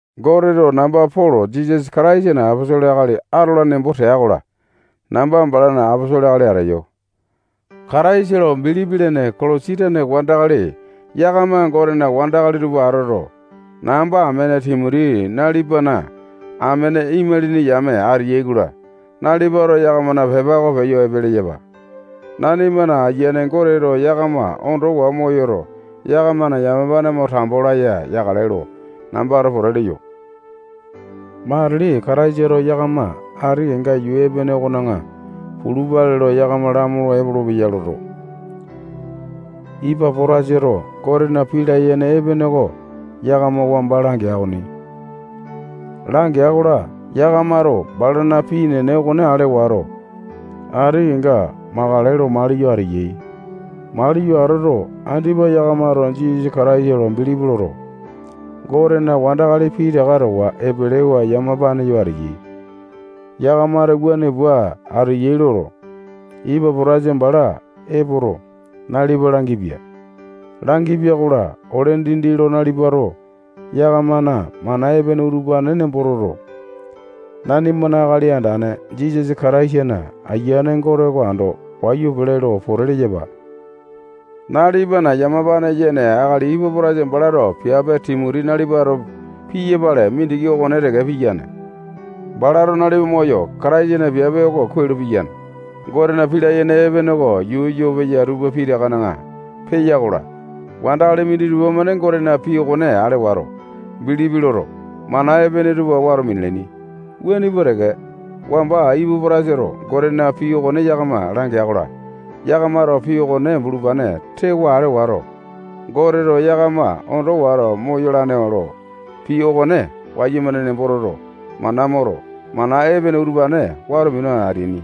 Goteto namba Polo Jisasa Kataisana aposolo akali atola nembo tea-kola, namba balana aposolo akali ateyo. Kataisa lo bilipi lene Kolosi tane wandakali yakama Gotena wandakali tupa atoto, namba amene Timoti nalipana amene imalini yame ateyai-kola, nalipato yakamana pepa oko peyo epe leyapa. Nanimana Ayiane Goteto yakama ondowa moyoto, yakamana yamapane mo tambo laya yakale lo nambato pote leyo. Matili Kataisato yakama ati kenga yuu epene okona pulupale lo yakama lamolo epolopeya loto, Ipapo-tasato Gotena pii layene epene oko yakama wamba langea okoni. Langea-kola, yakamato balana pii enene okone ale wato, ati kenga makale lo maliyo ateyai. Maliyo atoto, andipa yakamato Jisasa Kataisa lo bilipi loto, Gotena wandakali pitaka towa epelewa yamapane yo ateyai. Yakamato wuane pua ateyai loto, Ipapotasa bala epoto, nalipa langipia. Langipia-kola, ole dindi lo nalipato yakamana mana epene utupane nembo toto, nanimana Akali Andane Jisasa Kataisana Ayiane Gote oko ando wayu pele lo pote leyapa. Nalipana yamapane yene akali Ipapotasa balato piape Timoti nalipato piyapale mindiki okone teke piyane. Balato nalipa moyo, Kataisana piape oko kuai lo piyane. Gotena pii layene epene oko yuu yo peya tupa pitakana peya-kola, wandakali minditupa-mane Gotena pii okone ale wato, bilipi loto, mana epene tupa wato minalaini. Wuane pua teke, wamba Ipapo-tasato Gotena pii oko yakama langea-kola, yakamato pii okone bulupane tewa ale wato, Goteto yakama ondo wato moyalane lo pii okone wayumane nembo toto, mana moto, mana epene utupane wato minu ateaini.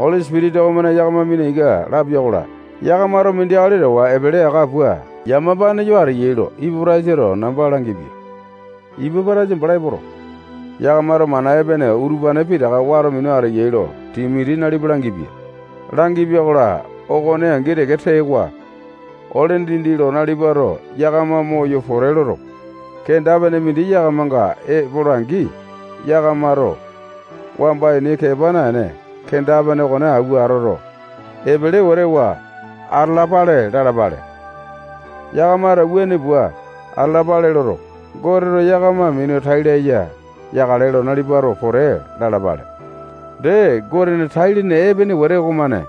Oli Sipitisa okomane yakama mina ika lapia-kola, yakamato mindi akali towa epele aka pua yamapane yo ateyai lo Ipapo-tasato namba langipia. Ipapotasa bala epoto, yakamato mana epene utupane pitaka wato minu ateyai lo Timoti nalipa langipia. Langipia-kola, okone angi teke tewa, ole dindi lo nalipato yakama moyo pote loto, kenda-pene mindi yakamanga epola-angi, yakamato wamba ini kepa naene, kenda-pene okone awua atoto, epele wete wa atalapale lalapale. Yakamato wuane pua atalapale loto, Goteto yakama minu tai laya yakale lo nalipato pote lalapale. Dee, Gotena tai-lene epene wete okomane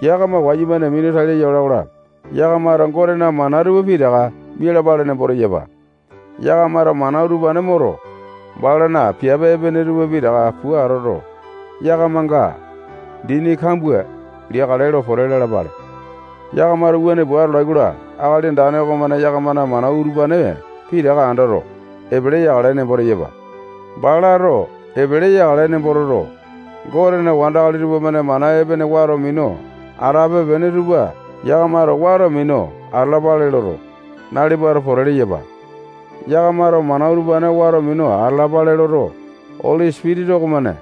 yakama wayumane minu tai laya ola-kola, yakamato Gotena mana tupa pitaka mialapale nembo teyapa. Yakamato mana utupane moto, balana piape epene tupa pitaka pua atoto, yakamanga dini kambua liyakale lo pote lalapale. Yakamato wuane pua atolai-kola, Akali Andane okomane yakamana mana utupane pitaka andoto, epele yakale nembo teyapa. Balato epele yakale nembo toto, Gotena wandakali tupamane mana epene wato minu atape-pene tupa yakamato wato minu atalapale loto, nalipato pote leyapa. Yakamato mana utupane wato minu atalapale loto, Oli Sipitisa okomane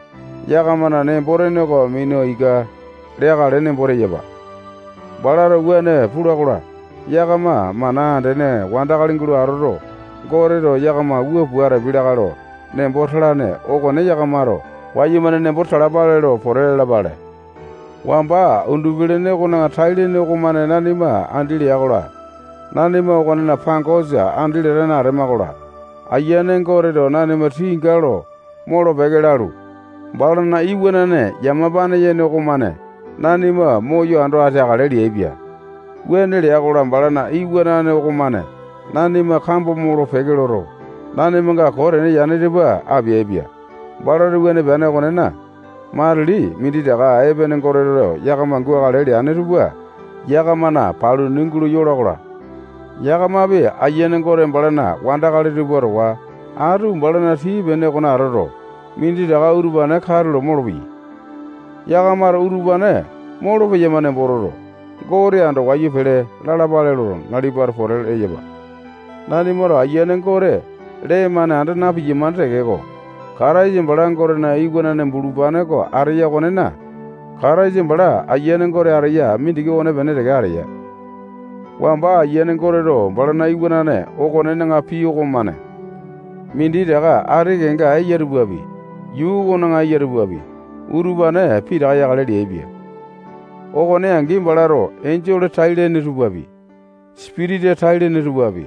yakamana nembo-tene oko mina ika leakale nembo teyapa. Balato wuane pula-kola, yakama mana andene wandakali gulo atoto, Goteto yakama wua pua atapiai lakae lo nembo talane okone yakamato wayumane nembo talapale lo pote lalapale. Wamba undupi-lene okona tai-lene okomane nanima andi lea-kola, nanima okonena pangosa andi latane atema-kola, Ayiane Goteto nanima tinga lo molo-peke lalu, balana iwanane yamapane yene okomane nanima moyo ando ateakale leaipia. Wuane lea-kola, balana iwanane okomane nanima kambo molo-peke loto, nanimanga koo tene yane tupa apeaipia. Balato wuane peane okonena, matili minditaka epene Goteto yakama gukale leane tupa yakamana paluni gulo yola-kola, yakamapi Ayiane Gote balana wandakali tupa towa atu balana tii-pene okona atoto, minditaka utupane katulo molopeyai. Yakamato utupane molopeyama nembo toto, Gote ando wayu pele lalapale loto, nalipato pote leyapa. Nanimato Ayiane Gote lee-mane anda na-piyamane tekeko, Kataisa bala Gotena iwanane bulupane oko ateya okonena, Kataisa bala Ayiane Gote ateya mindiki okonepene teke ateya. Wamba Ayiane Goteto balana iwanane okonena pii okomane minditaka ati kenga eya tupapi, yuu okona eya tupapi, utupane pitaka yakale leaipia. Okone angi, balato enjole tai-lene tupapi, sipitisa tai-lene tupapi,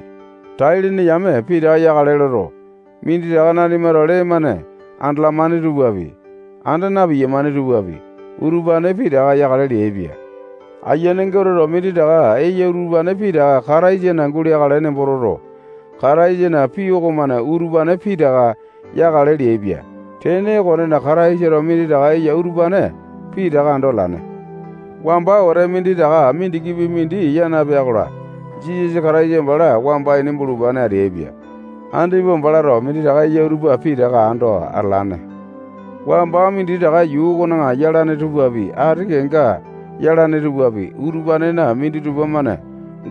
tai-lene yame pitaka yakale loto, minditaka nanimato lee-mane andalamane tupapi, anda na-piyamane tupapi, utupane pitaka yakale leaipia. Ayiane Goteto minditaka eya utupane pitaka Kataisana guleakale nembo toto, Kataisana pii okomane utupane pitaka yakale leaipia. Tene okonena, Kataisato minditaka eya utupane pitaka ando atalane. Wamba wete minditaka mindikipi mindi yaa napea-kola, Jisasa Kataisa bala wamba ini bulupane ateaipia. Andipa balato minditaka eya tupa pitaka ando atalane. Wamba minditaka yuu okona yalane tupapi, ati kenga yalane tupapi, utupanena minditupa-mane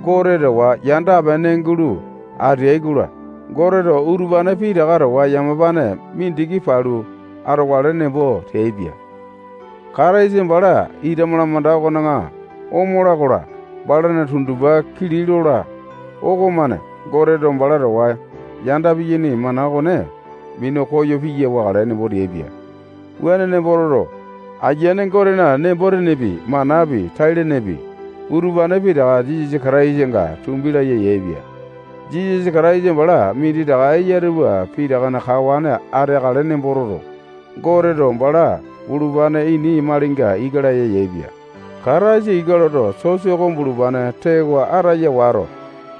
Gote towa yanda-pene gulo ateai-kola, Goteto utupane pitaka towa yamapane mindiki palu atokale nembo teaipia. Kataisa bala ita malamanda okona omola-kola, balana tundupa kili lola okomane Goteto bala towa yanda piyaini mana okone minu koyo piya wakale nembo teaipia. Wuane nembo toto, Ayiane Gotena nembo-tenepi, manapi, tai-lenepi, utupane pitaka Jisasa Kataisanga tumbi laya yaepia. Jisasa Kataisa bala minditaka eya tupa pitakana kawane ateakale nembo toto, Goteto bala bulupane ini malinga ika laya yaepia. Kataisato ika loto, sosa oko bulupane tewa ataya wato,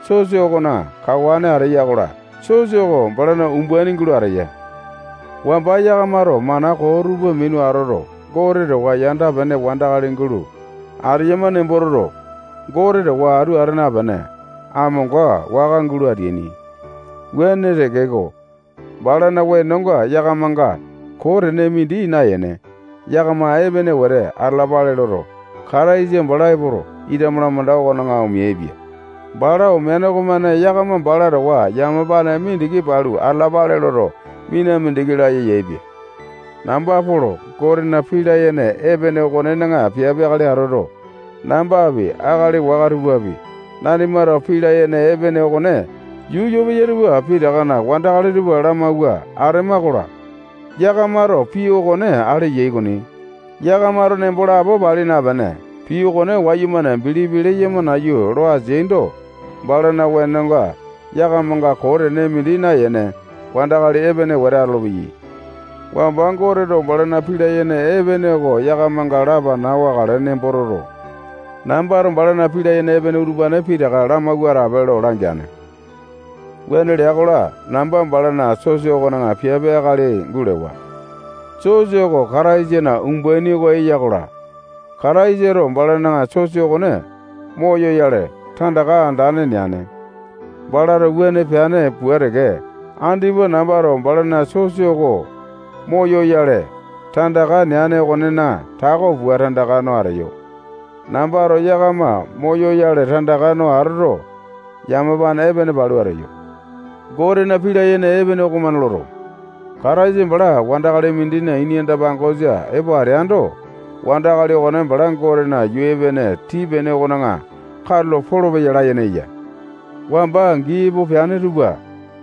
sosa okona kawane ateya-kola, sosa oko balana umbaini gulo ateya. Wamba yakamato mana koo tupa minu atoto, Gote towa yanda-pene wandakali gulo ateyama nembo toto, Gote towa atu ata napene, amonga waka gulo ateaini. Wuane tekeko, balana wenonga yakamanga koo tene mindi nayene, yakama epene wete atalalape loto, Kataisa bala epoto, ita malamanda okona omeaipia. Bala omeane okomane yakama bala towa yamapane mindiki palu atalapale loto, mina mindiki laya yaepia. Namba Polo Gotena pii layene epene okonena piape akali atoto, nambapi, akali waka tupapi, nanimato pii layene epene okone yuu yo peya tupa pitakana wandakali tupa lamawua atema-kola, yakamato pii okone ale yai okoni. Yakamato nembo lapo pali napene, pii okone wayumane bilipi leyama nayu lo ateaindo, balana wenonga yakamanga koo tene mindi nayene, wandakali epene wete atolopeyai. Wamba Goteto balana pii layene epene oko yakamanga lapana wakale nembo toto, nambato balana pii layene epene utupane pitaka lamawua atape lo langeane. Wuane lea-kola, namba balana sosa okona piape akali gulewa. Sosa oko Kataisana umbaini oko eya-kola, Kataisato balana sosa okone moyoyale, tandaka andane neane. Balato wuane peane pua teke, andipa nambato balana sosa oko moyoyale tandaka neane okonena tako pua tandaka no ateyo. Nambato yakama moyoyale tandaka no atoto, yamapane epene palu ateyo. Gotena pii layene epene okomane loto, Kataisa bala wandakali mindina ini anda-pangosa epo ateando, wandakali okone bala Gotena yuu epene tii-pene okona katulo polopeya layene eya. Wamba gii epo peane tupa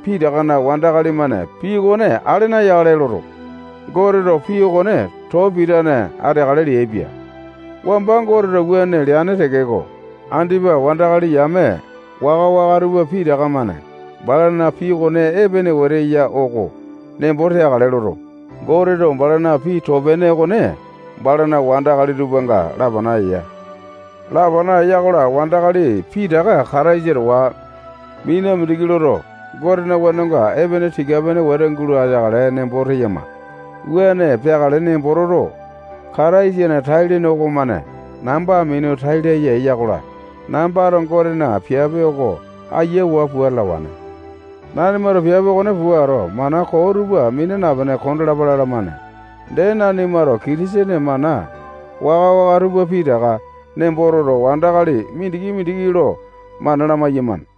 pitakana wandakali-mane pii okone ale nayakale loto, Goteto pii okone too pitane ateakale leaipia. Wamba Goteto wuane leane tekeko, andipa wandakali yame waka-waka tupa pitaka-mane balana pii okone epene wete eya oko nembo teakale loto, Goteto balana pii okone too-pene balana wandakali tupanga lapana eya. Lapana eya-kola, wandakali pitaka Kataisa towa mina mindiki loto, Gotena wenonga epene tika-pene wete gulo ateakale nembo teyama. Wuane peakale nembo toto, Kataisana tai-lene okomane namba minu tai laya eya-kola, nambato Gotena piape oko ayiawa pua atalawane. Nanimato piape okone puato, mana koo tupa mina napene kondalapa lalamane. Dee, nanimato Kitisene mana waka-waka tupa pitaka nembo toto, wandakali mindiki-mindiki lo mana lamai-yamane.